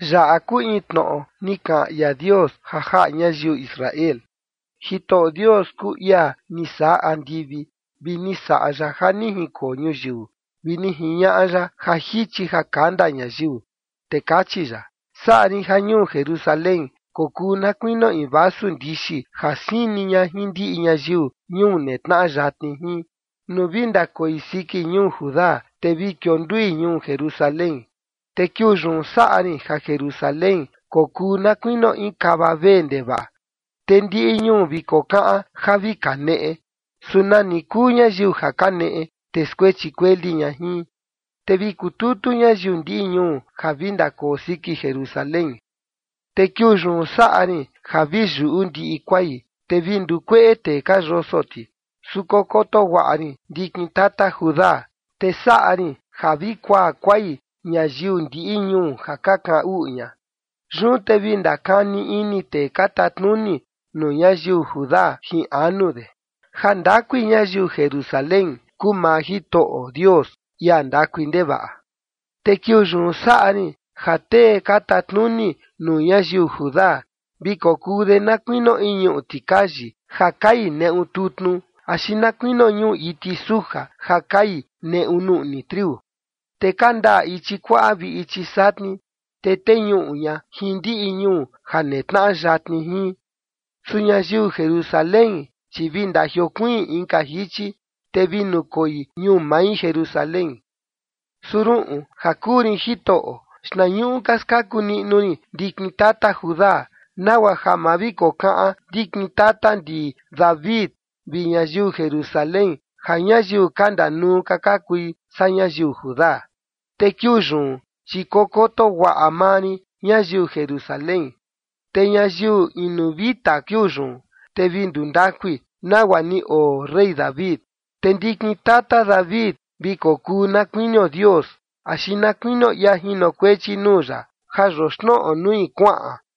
Yaꞌa kuu in tnoꞌo ni kaꞌan ia Dios ja jaꞌa ñayiu Israel. Jitoꞌo Dios kuu ia ni saꞌa andivi vi ni saꞌa ya ja ni jinkoo ñuyiu, vi ni jiñaꞌa ya ja jichi ja kanda ñayiu. Te kachi ya: “Saꞌa rin ja ñuu Jerusalén kokuu na kuinio in vasu ndixi ja sini ña jin ndiꞌi ñayiu ñuu netnaꞌa yatni jin, nuu vi ndakoi siki ñuu Judá te vi kiondui ñuu Jerusalén. Te kiuu yun saꞌa rin ja Jerusalén kokuu na kuinio in kava vee ndevaꞌa, te ndiꞌi ñuu vi kokaꞌan ja vi kaneꞌe. Su nani kuu ñayiu ja kaneꞌe, te skuechi kueli ña jin, te vi kututu ñayiu ndiꞌi ñuu ja vi ndakoo siki Jerusalén. Te kiuu yun saꞌa rin ja vi yuꞌu ndiꞌi kuai, te vi ndukueꞌe tee ka yoso ti. Su kokoto guaꞌa rin ndikin tata Judá, te saꞌa rin ja vi kuaa kuai ñayiu ndiꞌi ñuu ja ka kaꞌan uꞌu ña. Yun te vi ndakani ini tee ka tatnuni nuu ñayiu Judá jin anu de: Jandakui ñayiu Jerusalén kuu maa Jitoꞌo Dios, ia ndakui ndevaꞌa. Te kiuu yun saꞌa rin ja tee ka tatnuni nuu ñayiu Judá vi kokuu de na kuinio in ñuꞌu tikayi ja kai neꞌu tutnu, axi na kuinio ñuꞌu iti suja ja kai neꞌu nuꞌni triu. Te kandaꞌa ichi kuaꞌa vi ichi satni, te teñuꞌu ña jin ndiꞌi ñuu ja netnaꞌa yatni jin. Su ñayiu Jerusalén, chi vi ndajiokuiin inka jichi, te vi nukoi ñuu mai Jerusalén. ’Su ruꞌun, ja kuu rin Jitoꞌo, xtnañuꞌu ka skaku niꞌnu rin ndikin tata Judá, nagua ja ma vi kokaꞌan ndikin tata ndi David vi ñayiu Jerusalén, ja ñayiu ka ndanuu ka ka kui saa ñayiu Judá. Te kiuu yun, chi kokoto guaꞌa maa rin ñayiu Jerusalén, te ñayiu inu vita kiuu yun, te vi ndundakui nagua ni oo rey David. Te ndikin tata David vi kokuu na kuinio Dios, axi na kuinio ia jinokuechi nuu ya ja yoxnoꞌo nui kuaꞌan.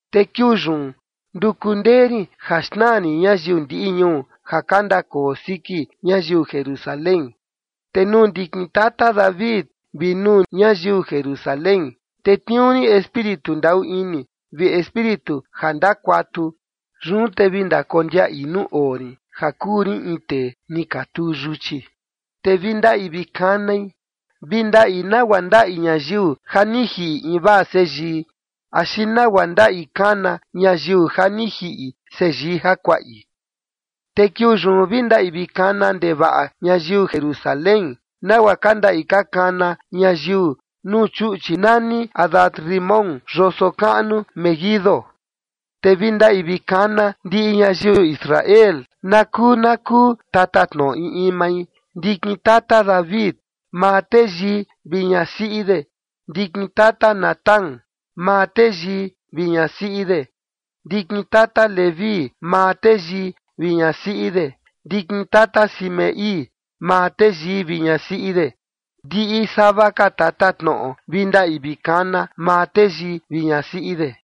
’Te kiuu yun nduku ndee rin ja xnaa rin ñayiu ndiꞌi ñuu ja ka ndakoo siki ñayiu Jerusalén. Te nuu ndikin tata David vi nuu ñayiu Jerusalén tetniuu rin Espíritu ndaꞌu ini vi Espíritu ja ndakuatu. Yun te vi ndakondiaꞌi nuu oo rin ja kuu rin in tee ni ka tuu yuchi, te vi ndaꞌi vi kanai. Vi ndaꞌi nagua ndaꞌi ñayiu ja ni jiꞌi invaa seyii axi nagua ndaꞌi kana ñayiu ja ni jiꞌi seyii jakuaꞌi. Te kiuu yun vi ndaꞌi vi kana ndevaꞌa ñayiu Jerusalén, nagua ka ndaꞌi ka kana ñayiu nuu chuꞌchi nani Hadad-rimón yoso kaꞌnu Meguido. Te vi ndaꞌi vi kana ndiꞌi ñayiu Israel, na kuu na kuu tatatnoꞌo in in mai, ndikin tata David, maa teyii vi ñasiꞌi de, ndikin tata Natán, maa teyii vi ñasiꞌi de, ndikin tata Leví, maa teyii vi ñasiꞌi de, ndikin tata Simei, maa teyii vi ñasiꞌi de. Ndiꞌi sava ka tatatnoꞌo vi ndaꞌi vi kana, maa teyii vi ñasiꞌi de.